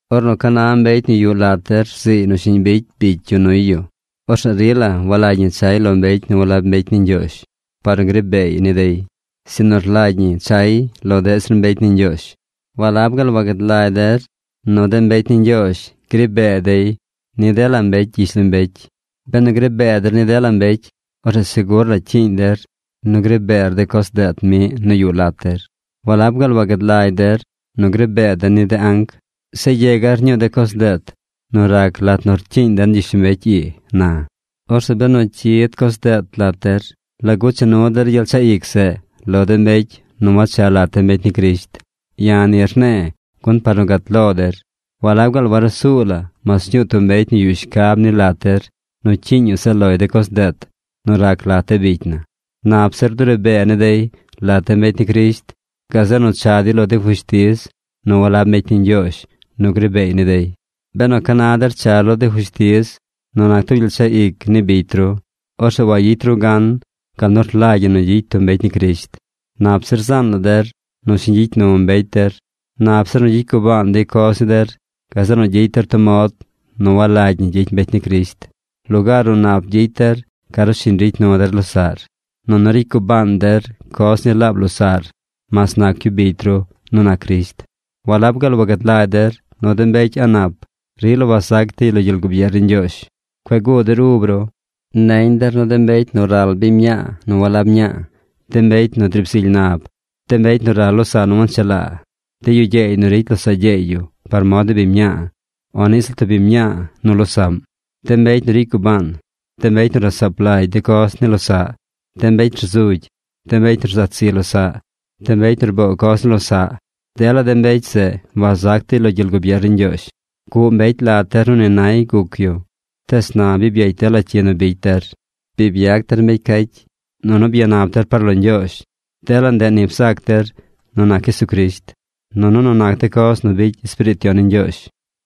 Ornu ca na mbecy nu yuꞌ lat der rziiy nu shiñ bicy bicy yu nuy yu, orzeꞌ rila walagy ñi chay lo mbecy nu walab mbecy ni Ñgyoozh par nu gri beey ni dey, sinu rlagy ñi chay lo deꞌ zir mbecy ni Ñgyoozh. ¿Walab gaal wagad lagy der nu de mbecy ni Ñgyoozh gri bee dey ni dela mbecy gyishlombecy? Benu gri bee der ni dela mbecy, orzeꞌ segur la cyiiñ der nu gri beer de coz deet miꞌ nu yuꞌ lat der. ¿Walab gaal wagad lagy der nu gri bee den ni de anc? ¡Zeꞌ yegar ñuu de coz deet nu rac lat nu rcyiiñ den gyishlombecy ii na! Orzeꞌ benu cyid coz deet lat der, ¿lagu cha nu der gyel chaꞌ ic zeꞌ lo de mbecy nu wacha lat de mbecy ni Crisht? Ya̱ ni rne̱e̱ gun par nu gat lo der. ¿Walab gaal warusuu la mas ñuu tub mbecy nu yuꞌ shcab ni lat der nu cyiiñ yu zaꞌ loy de coz deet nu rac lat de bicy na? Nap zir duri bee ni dey lat de mbecy ni Crisht, gazeꞌ nu cha dey lo de fushtiz nu walab mbecy ni Ñgyoozh nu gri beey ni dey. Benu ca na der char lo de fushtiz nu nac tub gyel chaꞌ ic ni bicy ru, orzeꞌ wayicy ru gan gal nu rlagy ñi nu gyicy tub mbecy ni Crisht. Nap zir zaan la der nu shiñ gyicy nu mbecy der. Nap zir nu gyicy gubaan dey coz ni der gazeꞌ nu gyicy der tub mod nu walagy ñi gyicy mbecy ni Crisht. Lugaar nu nap gyicy der, ca nu shiñ ricy nu der losaꞌr. ¡Nunu ricy gubaan der coz ni laab losaꞌr mas nac yu bicy ru nu nac Crisht! ¿Walab gaal wagad lagy der nu de mbecy a̱ꞌ nap rila wazac dey lo gyel gubier ni Ñgyoozh? Cueꞌ guu der ub ru. Neñ der nu de mbecy nu ral biñ mñaa nu walab mñaa, de mbecy nu driib zily nab, de mbecy nu ral losaꞌ nu wanchelaa, de yu gyeey nu ricy losaꞌ gyeey par mod ni biñ mñaa o niꞌ ziꞌl tub biñ mñaa nu losaꞌm, de mbecy nu ricy gubaan, de mbecy nu rasaap lagy de coz ni losaꞌ, de mbecy rzugy, de mbecy nu rzat zi losaꞌ, de mbecy nu rboo coz ni losaꞌ, dela de mbecy zeꞌ wazac dey lo gyel gubier ni Ñgyoozh. Guꞌ mbecy lat der nu ni nay guc yu. Tees na bi byecy dela cyi nu bicy der. Bi byac der mbecy cacy, nunu byanap der par lo Ñgyoozh. Dela ndeꞌ ni bzac der nu nac Jesucrisht, nunu nu nac de coz nu bicy Espiriit Yon ni Ñgyoozh.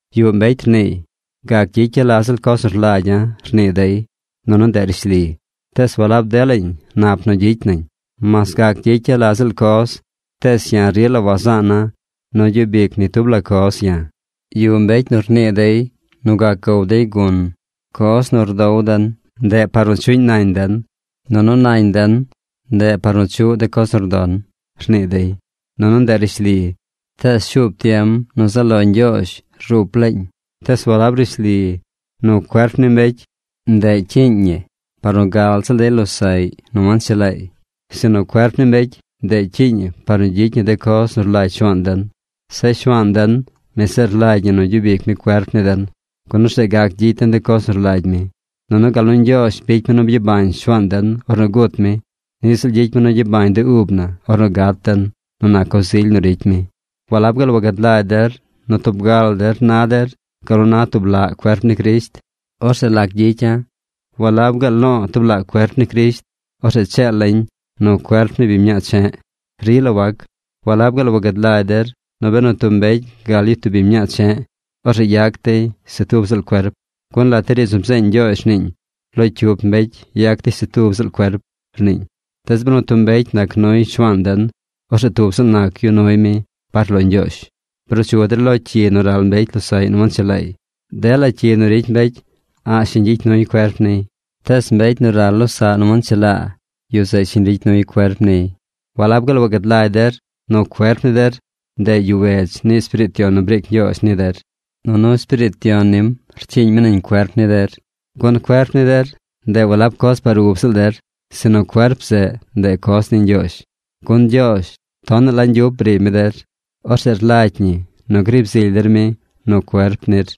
Yuꞌ mbecy rniiy: “Gac gyicya̱ la ziꞌl coz nu rlagya̱”, rnii dey. Nunu ndeꞌ rishli, tees walab delañ nap nu gyicy nañ. Mas gac gyicya̱ la ziꞌl coz tees ya̱ rila wazaana̱ nu gyub ic ni tub la coz ya̱. Yuꞌ mbecy nu rnii dey nu gac gow dey gun: “Coz nu rdow den, ndeꞌ par nu chuꞌñ nañ den, nunu nañ den ndeꞌ par nu chuꞌ de coz nu rdon”, rnii dey. Nunu ndeꞌ rishli, tees shuub tiem nu zaꞌ lo Ñgyoozh rup laañ. Tees walab rishli nu cuerp ni mbecy, ndeꞌ cyiiñ ni par nu gal ziꞌl dey losaꞌy nu wanchelaay. Sinu cuerp ni mbecy, ndeꞌ cyiiñ ñi par nu gyicy ñi de coz nu rlagy Shuaan den. Zeꞌ Shuaan den, mi zeꞌ rlagy ñi nu gyub ic mi cuerp ni den, gun orzeꞌ gac gyicy den de coz nu rlagy mi. Nunu gal nu Ñgyoozh bicy mi nu byabañ Shuaan den ornu gut mi, niꞌ ziꞌl gyicy mi nu gyabañ de ub na ornu gat den nu nac coz ily nu ricy mi. ¿Walab gaal wagad lagy der nu tub ga la der na der gal nu na tub laꞌ cuerp ni Crisht? ¿Orzeꞌ lac gyicya̱? ¿Walab gaal lo̱o̱ tub laꞌ cuerp ni Crisht; orzeꞌ cheela̱ñ nu cuerp ni biñ mñaa che̱ꞌ? Rila wac. ¿Walab gaal wagad lagy der nu benu tub mbecy gal yu tub biñ mñaa che̱ꞌ, orzeꞌ yac dey se tub ziꞌl cuerp? Gun lat de riidz nu bzeeñ Ñgyoozh rniiñ: “Lo cyup mbecy yac dey se tub ziꞌl cuerp”, rniiñ. Tees benu tub mbecy nac nuy Shuaan den, orzeꞌ tub ziꞌl nac yu nuy mi par lo Ñgyoozh. Bruu chu der lo cyi nu ral mbecy losaꞌy nu wanchelaay. Dela cyi nu ricy mbecy a̱ꞌ shiñ gyicy nuy cuerp niy. Tees mbecy nu ral losaꞌ nu wanchelaa, yu zeꞌ shiñ ricy nuy cuerp niy. ¿Walab gaal wagad lagy der nu cuerp ni der, ndeꞌ yuꞌ wedz ni Espiriit Yon nu briic Ñgyoozh ni der, nunu Espiriit Yon nim rcyiiñ mi nañ cuerp ni der? Gun cuerp ni der, ndeꞌ walab coz par ub ziꞌl der, sinu cuerp zeꞌ, ndeꞌ coz ni Ñgyoozh. Gun Ñgyoozh tonaꞌ la ñgyup briib mi der. Orzeꞌ rlagy ñi nu griib zily der mi nu cuerp nir.